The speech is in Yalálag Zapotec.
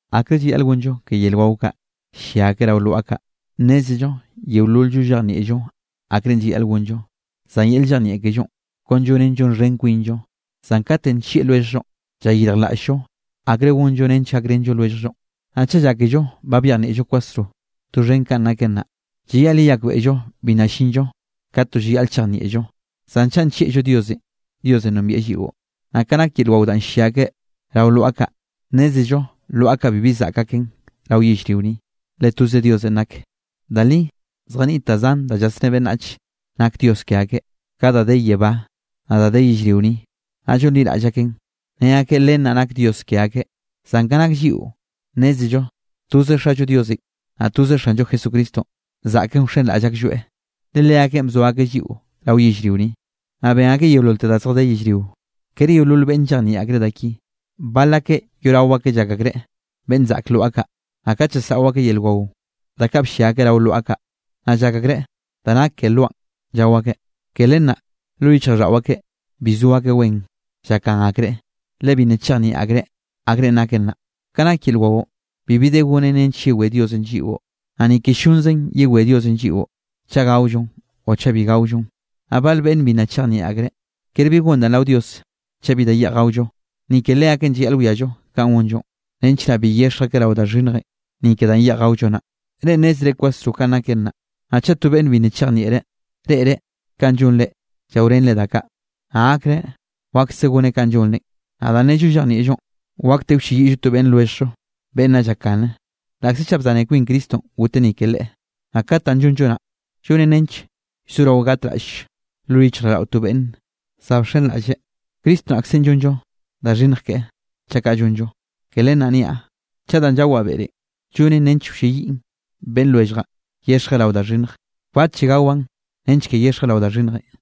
Akre llayaꞌl gonllo ke yel wao kaꞌ ll-llia akeꞌ rao lwaꞌa kaꞌ. Nnézello yeolol-llo llejnieꞌllo akrenꞌ llayaꞌl gonllo. Zan yel llejnieꞌ kellonꞌ, kon llonen llonxhen kwinllo. Zan katenꞌ nllieꞌ lwelljllonꞌ, llayirjlaꞌll-llo akre gonllo nench gakrenllo lwelljllonꞌ. Naꞌ chaꞌ llákello ba byejnieꞌllo kwasro doxhen kanꞌ naken naꞌ, llayaꞌl yeyakbeꞌllo bi nna llinllo ka to llayaꞌl chejnieꞌllo. Zan chaꞌ nllieꞌllo Diosenꞌ, Diosenꞌ nombieꞌ lliꞌo. Naꞌ ka nak yel wao danꞌ ll-llia akeꞌ rao lwaꞌa kaꞌ, nnézello lwaꞌa kaꞌ bibi zaꞌk aken rao yellrio ni, le toze Diosenꞌ nak. Da li zjaniꞌt da zan da llasné beꞌnnach nak dios ke akeꞌ, ka da de yebá, naꞌ da de yellrio ni, naꞌ llonliraꞌll akeꞌn ne akeꞌ len naꞌ nak dios ke akeꞌ. Zan ka nak lliꞌo nnézello toze Xallo Diosenꞌ, naꞌ toze Xanllo Jesucristonꞌ zaꞌken wxenraꞌll aklloeꞌ, le Leakeꞌn bzo akeꞌ lliꞌo rao yellrio ni, naꞌ ben akeꞌ yeololte da zjadé yellrio. Kere yeolol beꞌnne llejnieꞌ akreꞌ da ki. Bal akeꞌ yoꞌrao akeꞌ llak akreꞌ beꞌnn zaꞌk lwaꞌa kaꞌ, naꞌ kat llasaꞌo akeꞌ yel wao, da kaꞌ bllia akeꞌ rao lwaꞌa kaꞌ, naꞌ llak akreꞌ da nak ke lwaꞌn llao akeꞌ. Ke len naꞌ lo yichjraꞌlldaꞌo akeꞌ, bi zo akeꞌ wen llakgan akreꞌ, le bi nna chejnieꞌ akreꞌ akrenꞌ naken naꞌ. Ka nak yel waonꞌ bibi de gonen nench yewé Diosenꞌ lliꞌo, naꞌ ni ke ll-llonzen yewé Diosenꞌ lliꞌo chaꞌ gaollon o chaꞌ bi gaollon. Naꞌ bal beꞌnne bi nna chejnieꞌ akreꞌ, kere bi gon danꞌ rao Dios chaꞌ bi da yeꞌj gaollo. Ni ke leakeꞌn llayaꞌl wiallo kanꞌ gonllonꞌ, nench naꞌ bi yexj akeꞌ rao da xhinnjenꞌ, ni ke danꞌ yeꞌj gaollo naꞌ. Reꞌ nnézere kwasro kanꞌ naken naꞌ. Naꞌ chaꞌ to beꞌnne bi nna chejnieꞌreꞌ, reꞌreꞌ kanꞌ llonre llaorenre da kaꞌ, naꞌ gakreꞌ wakse goneꞌ kanꞌ llonrenꞌ. Naꞌ danꞌ nnello llejnieꞌllonꞌ, wakte wlleyiꞌllo to beꞌnn lwelljllo beꞌnn nna llakgane, laꞌkze chaꞌ bzane kwin Cristonꞌ goteꞌ ni ke leꞌe. Naꞌ kat danꞌ llonllo naꞌ, llonen nench llzorao gatraꞌll lo yichjraꞌlldaꞌo to beꞌnn za bxenraꞌlle, Cristo naꞌkzenꞌ llonllo da xhinnj keꞌe, chaꞌ kaꞌ llonllo. Ke len naꞌ niaꞌ, chaꞌ danꞌ llawaꞌ beꞌrenꞌ, llonen nench wlliꞌyen beꞌnn lwelljaꞌn yexjeꞌ rao da xhinnj, kbatlle gawaꞌn nench ke yexjeꞌ rao da xhinnjenꞌ.